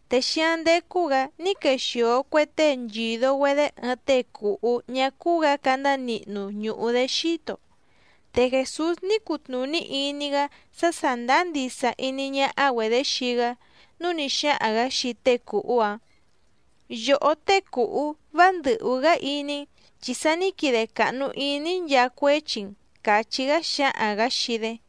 Te xíáⁿ ndécú‑gǎ ní quexìo cue tée nchìdo‑güedé ɨɨⁿ tée cùhú ñá cúú‑gǎ candá nihnu ñùhu‑dé xíto, te Jèsús ní cutnùní iní‑gá sá sàndáá ndisa iní ñáhá‑güedě xii‑gá nǔu ní xáhaⁿ‑gǎ xii tée cùhú‑áⁿ: —Yòhó tée cùhú vá ndɨ̀hú‑gá iní‑n, chi sa ní quide càhnu iní‑í nchaa cuéchi‑n —càchí‑gá xǎhaⁿ‑gǎ xii‑dé.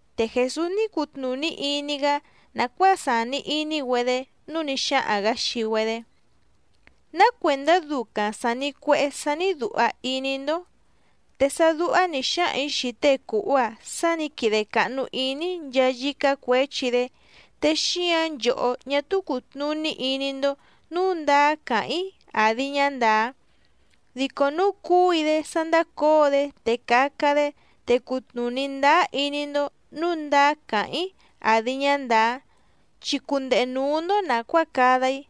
Te Jèsús ní cutnùní iní‑gá nàcuáa sàni iní‑güedé nǔu ní xáhaⁿ‑gǎ xii‑güedé: —¿Ná cuèndá ducaⁿ sàni cuehé sání dùha iní‑ndó? Te sá dúhá nǐ xáhaⁿ‑ǐ xii tée cùhú‑a sá nǐ quide càhnu iní‑í nchaa yícá cuěchi‑dé, te xíǎⁿ nchòhó ñá túú cùtnuní iní‑ndó nǔu ndáá càháⁿ‑í àdi ñá ndàá. Dico núu cúu‑í‑dé sá ndácǒo‑dé te caca‑dé, te cutnùní ndáá iní‑ndó nǔu ndáá càháⁿ‑í àdi ñá ndàá, chi cundehe nǔú‑ndó nàcuáa cada‑í.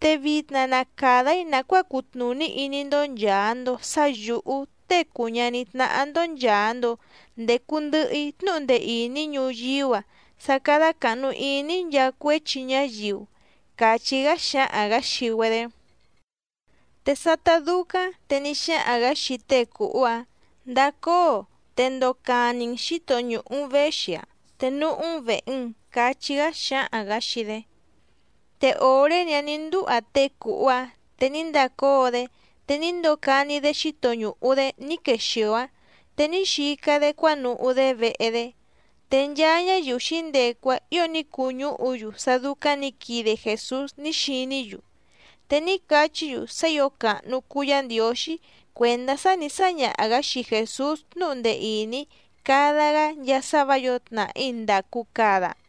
Te vitna na càda‑í nàcuáa cutnùní iní‑ndó nchàa‑ndo sá yǔhú Tée cùu ñaní tnáhá‑ndó nchàa‑ndo ndecu ndɨhɨ‑í tnúhu ndee ìní ñuyíú‑a sá cádá càhnu iní‑í nchaa cuéchi ñáyiu —càchí‑gá xǎhaⁿ‑gǎ xii‑güedé. Te sátá dúcáⁿ te ní xáhaⁿ‑gǎ xii té cùhú‑áⁿ: —Ndacóo, te ndocani‑n xǐto ñùhu‑n véxi‑áⁿ te núhú‑n vèhe‑n —cachí‑gá xǎhaⁿ‑gǎ xii‑dé. Te òré‑ni‑áⁿ nǐ ndúha tée cùhú‑áⁿ te ní ndacóo‑dé te ní ndocani‑dé xíto ñùhu‑dé ní quexìo‑áⁿ te ní xica‑dé cuánuhú‑dé vehe‑dé. Te nchaa ñáyiu xǐndecu‑áⁿ ǐo ní cuñúhu‑yu sá dúcáⁿ nǐ quide Jèsús ní xiní‑yu, te ní cachí‑yu sá ǐo càhnu cuu Yá Ndiǒxí cuèndá sá nǐ sáñaha‑gǎ xii Jèsús tnúhu ndee ìní cada‑gá nchaa sá vǎ yǒo tnàhí ndàcu cada.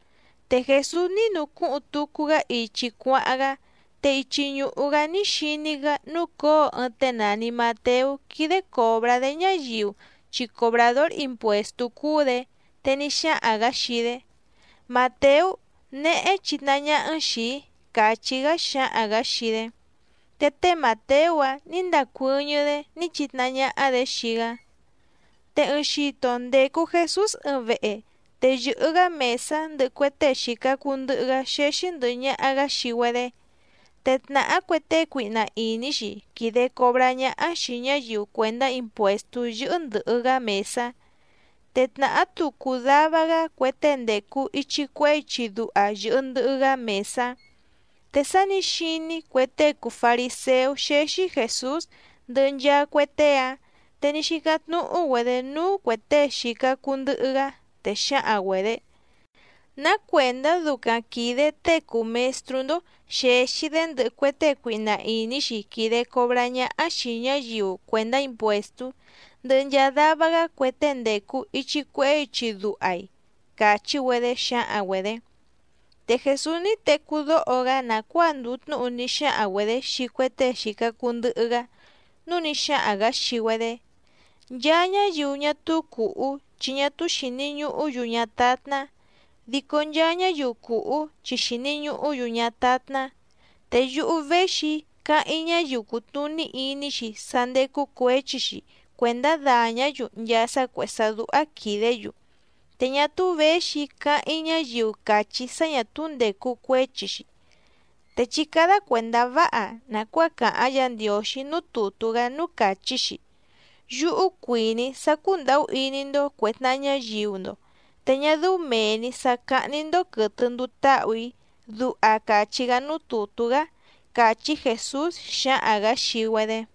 Te Jèsús ní nucúhuⁿ tucu‑gá ichi cuáháⁿ‑gá, te ichi ñùhu‑gá ní xiní‑gá núcǒo ɨɨⁿ tée nàni Mateú quídé còbrá‑dé ñáyiu chi cobràdór impuèstú cúú‑dě, te ní xáhaⁿ‑gǎ xii‑dé: —Màteú, néhé chitnahá ñáhá‑n xìi‑í —càchí‑gá xǎhaⁿ‑gǎ xii‑dé. Te té Màteú‑áⁿ nǐ ndacuɨ́ñɨ́‑dé ní chitnahá ñáhá‑dě xii‑gá. Te ɨɨⁿ xito ndècu Jesús ɨɨⁿ vehe, te yɨ̀hɨ‑gá mèsá ndɨhɨ cue tée xìca cuu ndɨhɨ‑gá xéxí ndɨ̀hɨ ñaha‑gá xii‑güedé. Te tnàhá cue tée cuihna ìní‑xi quìde cobrá ñáhá xìi ñáyiu cuèndá impuèstú yɨ́hɨ́ ndɨ̀hɨ‑gá mèsá, te tnàhá tucu dava‑gá cue tée ndècu ichi cuehé ichi duha yɨ̀hɨ ndɨhɨ‑gá mèsá. Te sá nǐ xiní cue tée cùu fariséú xéxí Jèsús ndɨhɨ nchaa cue tée‑áⁿ, te ní xícáⁿ tnúhú‑güedě núú cuè tée xìca cuu ndɨhɨ‑gá, te xǎhaⁿ‑güedě: —¿Ná cuèndá ducaⁿ quìde tée cùu mestrú‑ndó xèxi‑dé ndɨhɨ cue tée cuihna ìní‑xi quìde cobrá ñáhá xìi ñáyiu cuèndá impuèstú, ndɨhɨ nchaa dava‑gá cue tée ndècu ichi cuehé ichi duha‑i? —càchí‑güedé xǎhaⁿ‑güedě. Te Jèsús ní tecú dóho‑gá nàcuáa ndùu tnúhu ní xáhaⁿ‑güedě xii cue tée xìca cuu ndɨhɨ‑gá, núu ní xáhaⁿ‑gǎ xii‑güedé: —Nchaa ñáyiu ñá túú cùhú chi ñá túú xìni ñuhú‑yu ñátátná, dico nchaa ñáyiu cùhú chi xìni ñuhú‑yu ñátátná. Te yúhú véxi‑í cáháⁿ‑í ñáyiu cùtnuní iní‑xi sá ndécú cuěchi‑xi cuèndá dàñá‑yu nchaa sá cuèhé sá dúhá quìdé‑yu, te ñá túú věxi‑í cáháⁿ‑í ñáyiu càchí sá ñà túú ndècu cuéchi‑xi. Te chí cádá cuèndá váha nàcuáa càháⁿ Yǎ Ndiǒxí núú tùtú‑gá núú càchí‑xi: “Yúhú cuìní‑í sá cúndàhú iní‑ndó cuè tnaha ñáyiu‑ndo, te ñá dɨ́ú mèe‑ni sá cáhní‑ndó quɨ̀tɨ nduu táhù‑í”, duha càchí‑gá núú tùtú‑gá —càchí Jèsús xǎhaⁿ‑gǎ xii‑güedé.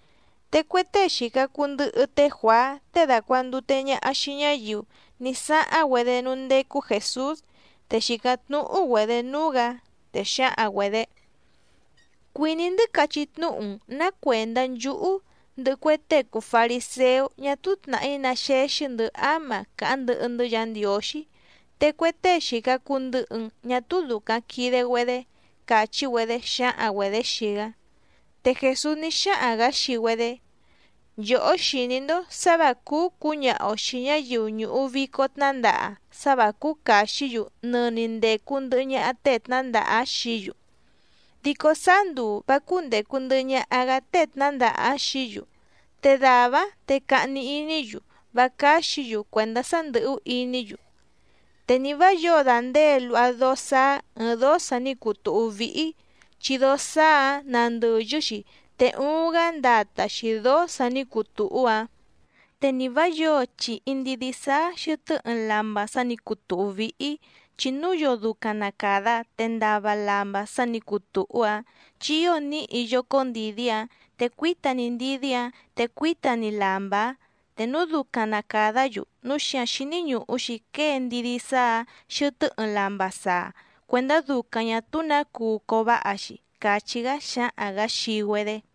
Te cue tée xìca cuu ndɨhɨ té Juàá tée dàcuandute ñaha xii ñáyiu ní sáháⁿ‑güedé núú ndécú Jèsús, te xìcáⁿ tnúhú‑güedě núú‑gǎ, te xǎhaⁿ‑güedě: —Cuìní‑ndɨ́ cachí tnúhu‑n nǎ cuèndá nchúhú, ndɨhɨ cue tée cùu fariséú ñá túú tnàhí ná xéxí‑ndɨ̌ áma càháⁿ ndɨhɨ‑ndɨ́ Yǎ Ndiǒxí, te cue tée xìca cuu ndɨhɨ‑n ñá túú dùcaⁿ quide‑güedé —càchí‑güedé xǎhaⁿ‑güedě xii‑gá. Te Jèsús ní xáhaⁿ‑gǎ xii‑güedé: —Nchòhó xìní‑ndó sǎ vǎ cúú cǔñaha‑o xìi ñáyiu ñùhu vico tnándaha sá vǎ cúú càxí‑yu nɨni ndècu ndɨhɨ ñaha tée tnǎndaha xií‑yu, dico sáá nduu vǎ cúndècu ndɨhɨ ñaha‑gá tée tnǎndaha‑áⁿ xií‑yu, te dàvá‑áⁿ te cahni iní‑yu vá cáxǐ‑yu cuèndá sá ndɨ̀hú iní‑yu. ’Te ni vǎ yǒo dàndée luha dóó sáá ɨ̀ɨⁿ dóó sa ní cuu tùhú víhí, chi dóó sáá‑ǎⁿ nàndɨyɨ‑xi te uuⁿ‑gá ndata‑xi dǒó sǎ nǐ cuu tùhú‑áⁿ. Te ni vǎ yǒo chìhi ndidí sáá xɨ̀tɨ́ ɨɨⁿ lamba sa ní cuu tùhú víhí, chi núu yoo ducaⁿ na càda te ndava lamba sa ní cuu tùhú‑áⁿ chi ío níhi yócó ndìdí‑áⁿ, te cuíta‑ni ndidí‑áⁿ te cuíta‑ni lamba‑áⁿ te núu ducaⁿ na càdá‑yu, núu xíǎⁿ xíní ñùhu‑xi quée ndidí sáá‑ǎⁿ xɨtɨ́ ɨɨⁿ lamba saa cuèndá ducaⁿ ñà túú nǎ cuu cováha‑xi —càchí‑gá xǎhaⁿ‑gǎ xii‑güedé.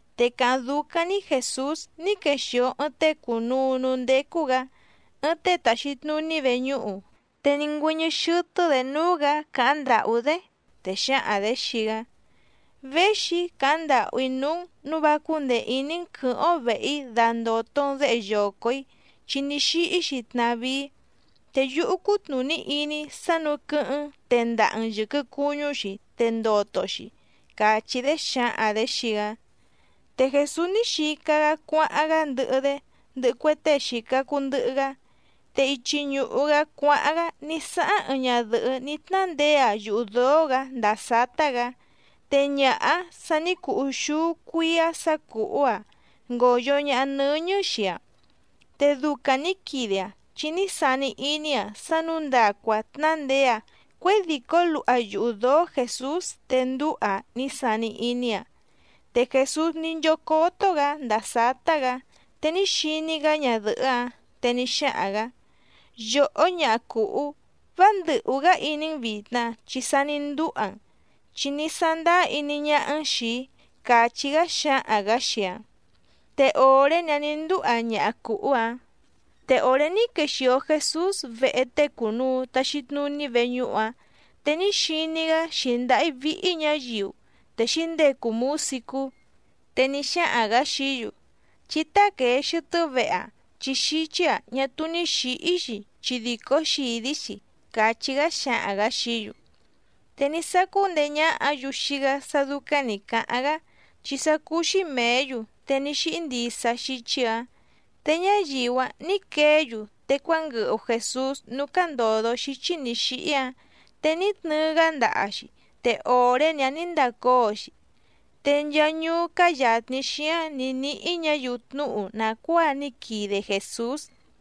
Te càháⁿ dúcáⁿ‑ní Jèsús ní quexìo ɨɨⁿ tée cùnuu núú ndécú‑gǎ, ɨɨⁿ tée tàxi tnuní veñúhu, te ní ngüɨ́ñɨ́ xɨ́tɨ́‑dě núú‑gǎ càháⁿ ndàhú‑dé, te xǎhaⁿ‑dě xii‑gá: —Véxi‑í càháⁿ ndàhú‑í núú‑n nǔu vá cúndèe iní‑n quɨ̌hɨ́ⁿ‑ó vèhe‑í dandòto‑n déhe yoco‑ǐ chi ní xíhí‑xi tnàvíí, te yúhú cútnùní iní‑í sá nǔu quɨ́hɨ́ⁿ‑n tèndaha‑n yɨquɨ cuñú‑xi te ndoto‑xi —càchí‑dé xǎhaⁿ‑dě xii‑gá. Te Jèsús ní xica‑gá cuáháⁿ‑gá ndɨhɨ‑dé ndɨhɨ cue tée xìca cuu ndɨhɨ‑gá. Te ichi ñùhu‑gá cuáháⁿ‑gá ní sáháⁿ ɨɨⁿ ñadɨ̀hɨ́ ní tnándeé‑aⁿ yuhu dǒó‑gǎ ndàa sátá‑gǎ, te ñaha‑áⁿ sa ní cuu úxúú cuíá sǎ cùhú‑aⁿ ngòyo ñaha nɨ́ñɨ́ xii‑aⁿ. Te ducaⁿ nǐ quide‑aⁿ chi ní sani iní‑aⁿ sá nǔu ndacu‑aⁿ tnándeé‑aⁿ cuědìcó luha yuhu dǒó Jèsús te ndúha‑aⁿ ní sani iní‑aⁿ. Te Jèsús ní nchócótó‑gǎ ndàa sátá‑gǎ te ní xiní‑gá ñadɨ̀hɨ́‑áⁿ, te ní xáhaⁿ‑gǎ: —Yòhó ñaha cùhú, vá ndɨ̀hú‑gá iní‑n vìtna chi sa ní ndúha‑n, chi ní sándáá iní ñáhá‑n xìi‑í —càchí‑gá xǎhaⁿ‑gǎ xii‑aⁿ. Te òré‑ni‑áⁿ nǐ ndúha ñaha cùhú‑ǎⁿ. Te òré ní quexìo Jesús vehe tée cùnuu taxi tnuní veñúhu‑áⁿ, te ní xiní‑gá xǐndáhí víhí ñǎyiu, te xǐndecu mǔsicú. Te ní xáhaⁿ‑gǎ xií‑yu: —Chí táquèe xɨtɨ́ vehe‑a, chi xíchí‑a ñá túú ní xǐhí‑xi chi dìcó xìdí‑xi —càchí‑gá xǎhaⁿ‑gǎ xií‑yu. Te ní sácú ndeé ñáhǎ‑yu xii‑gá sá dúcáⁿ nǐ cáháⁿ‑gá, chi sá cúú‑xí mèé‑yu te ní xíhí ndisa xíchí‑ǎⁿ. Te ñáyiu‑áⁿ nǐ queé‑yu te cuánguɨhu Jèsús núú cándòdo xíchí nǐ xíhí‑áⁿ, te ní tnɨɨ‑gá ndaha‑xi te òré‑ni‑áⁿ nǐ ndacóo‑xi. Te nchaa ñuú cáá yàtni xíáⁿ nǐ níhí ñǎyiu tnúhu nàcuáa ní quide Jèsús.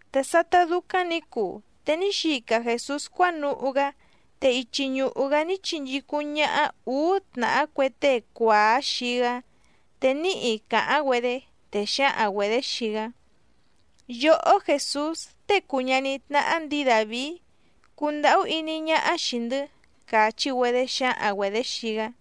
Te sátá dúcáⁿ nǐ cuu te ní xica Jèsús cuánuhú‑gá, te ichi ñùhu‑gá ní chinchícúⁿ ñáhá ǔú tnàhá cue tée cuàá xii‑gá, te níhi càháⁿ‑güedé, te xǎhaⁿ‑güedě xii‑gá: —Yòhó Jèsús, tée cùu ñaní tnáhá ndǐi Dàvií, cundàhú iní ñáhá xìi‑ndɨ́ —càchí‑güedé xǎhaⁿ‑güedě xii‑gá.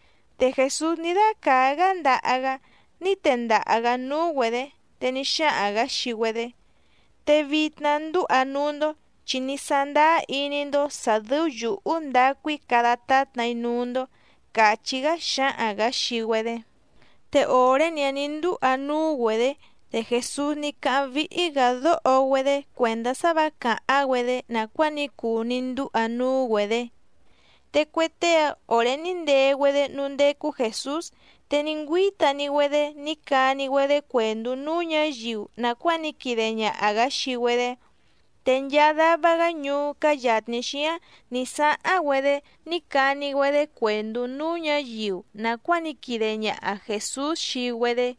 Te Jèsús ní dácàá‑gá ndaha‑gá ní tendaha‑gǎ núú‑güedě, te ní xáhaⁿ‑gǎ xii‑güedé: —Te vitna, ndúha núú‑ndó chi ní sándáá iní‑ndó sǎ dɨ́ú yǔhú ndacu‑í cada tátna‑í núú‑ndó —càchí‑gá xǎhaⁿ‑gǎ xii‑güedé. Te òré‑ni‑áⁿ nǐ ndúha núú‑güedě, te Jèsús ní cáháⁿ víhí‑gǎ dóho‑güedé cuèndá sá vǎ càháⁿ‑güedé nàcuáa ní cuu ní ndúha núú‑güedě. Te cue tée‑áⁿ òré ní ndee‑güedé núú ndécú Jèsús, te ní ngüíta‑ni‑güedé ní cani‑güedé cuèndú núú ñǎyiu nàcuáa ní quide ñaha‑gǎ xii‑güedé. Te nchaa dava‑gá ñuú cáá yàtni xíáⁿ nǐ sáháⁿ‑güedé ní cani‑güedé cuèndú núú ñǎyiu nàcuáa ní quide ñaha Jèsús xii‑güedé.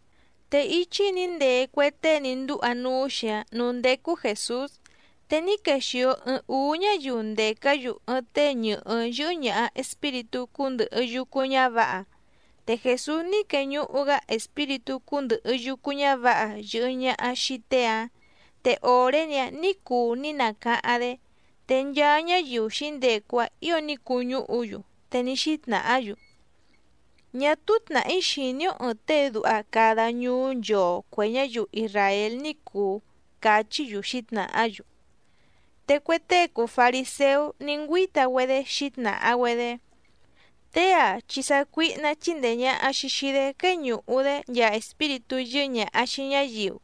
Te íchí nǐ ndee cue tée ní ndúha núú‑xi‑áⁿ nǔú ndécú Jèsús, te ní quexìo ɨɨⁿ úú ñáyiu ndècá‑yu ɨɨⁿ tée ñɨ̀hɨ́ yɨ́hɨ́ ñàha espíritú cúndɨ̀hɨ yucu ñávǎha. Te Jèsús ní queñuhu‑gá espíritú cúndɨ̀hɨ yucu ñávǎha yɨ̀hɨ ñaha xii tée‑áⁿ, te òré‑ni‑áⁿ nǐ cuu ní nacáháⁿ‑dé. Te nchaa ñáyiu xǐndecu‑áⁿ ǐo ní cuñúhu‑yu, te ní xítnàhá‑yu: —Ñá túú tnàhí xìní‑ó ɨ̀ɨⁿ tée duha cada ñuú nchoo cuè ñáyiu isràél ní cùu —cachí‑yu xǐtnàhá‑yu. Te cue tée cùu fariséú ní ngüíta‑güedé xǐtnàha‑güedé: —Tée‑a chi sácuíhná chíndèe ñaha‑xi xii‑dé quéñùhu‑dé nchaa espíritú yɨ́hɨ́ ñàha xii ñáyiu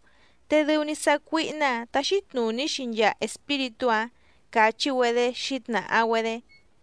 te dɨu‑ni sácuíhná‑ǎⁿ táxí tnùní‑xi nchaa espíritú‑áⁿ —càchí‑güedé xǐtnàha‑güedé.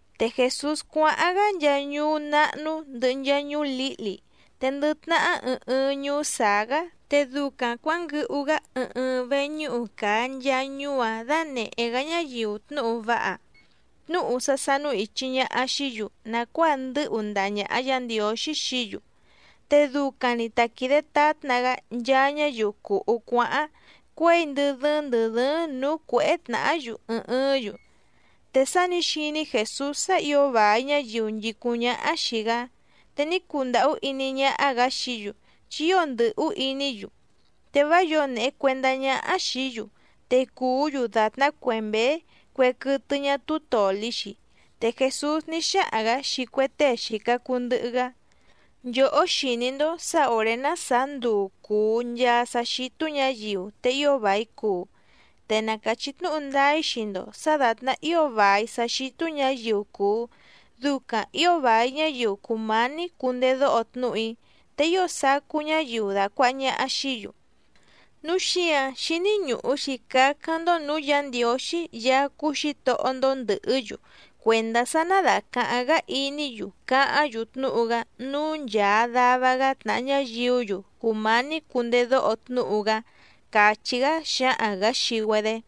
Te Jèsús cuáháⁿ‑gá nchaa ñuú náhnú ndɨ̀hɨ nchaa ñuú lǐhli, te ndɨ tnahá ɨɨⁿ ɨɨⁿ ñuú sàá‑gá te ducaⁿ cuǎnguɨhu‑gá ɨɨⁿ ɨɨⁿ veñúhu càa nchaa ñuú‑áⁿ dánèhé‑gá ñáyiu tnúhu váha, tnúhu sá sánú ìchi ñaha xií‑yu nàcuáa ndɨ́hu ndaha ñàha Yá Ndiǒxí xií‑yu. Te ducaⁿ‑ni ta quìde tátna‑gá nchaa ñáyiu cùhú cuáháⁿ cuěi ndɨ dɨ́ɨ́ⁿ ndɨ̀ dɨ́ɨ́ⁿ nǔú cuěhé tnàhá‑yu ɨɨⁿ ɨɨ́ⁿ‑yu. Te sá nǐ xiní Jèsús sá ǐo vài ñáyiu nchìcúⁿ ñáhá xìi‑gá, te ní cundàhú iní ñáhá‑gǎ xií‑yu chi ío ndɨ̀hú iní‑yu, te vá yǒo nèhe cuendá ñáhá xìí‑yu, te cùú‑yu dàtná cue mběé cue quɨtɨ ñá túú tòli‑xi. Te Jèsús ní xáhaⁿ‑gǎ xii cue tée xìca cuu ndɨhɨ‑gá: —Nchòhó xìní‑ndó sǎ òré ná sàá nduu cùu nchaa sá xítú ñǎyiu te ío vài cuu. Te na càchí tnúhu ndáá‑í xii‑ndo sǎ dàtná ío vài sá xítú ñǎyiu cùu, ducaⁿ ǐo vài ñáyiu cùmání cundedóho tnúhu‑í, te ío sacú ñáyiu dàcuaha ñaha xií‑yu. Núu xíǎⁿ xíní ñùhu‑xi cácáⁿ‑ndó nǔú Yǎ Ndiǒxí Yaá cúú Xǐtohó‑ndó ndɨ̀hɨ́‑yu cuèndá sá ná dàcaháⁿ‑gá iní‑yu cáháⁿ‑yu tnúhu‑gá núú nchàa dava‑gá tnàha ñáyiú‑yu cùmání cundedóho tnúhu‑gá —càchí‑gá xǎhaⁿ‑gǎ xii‑güedé.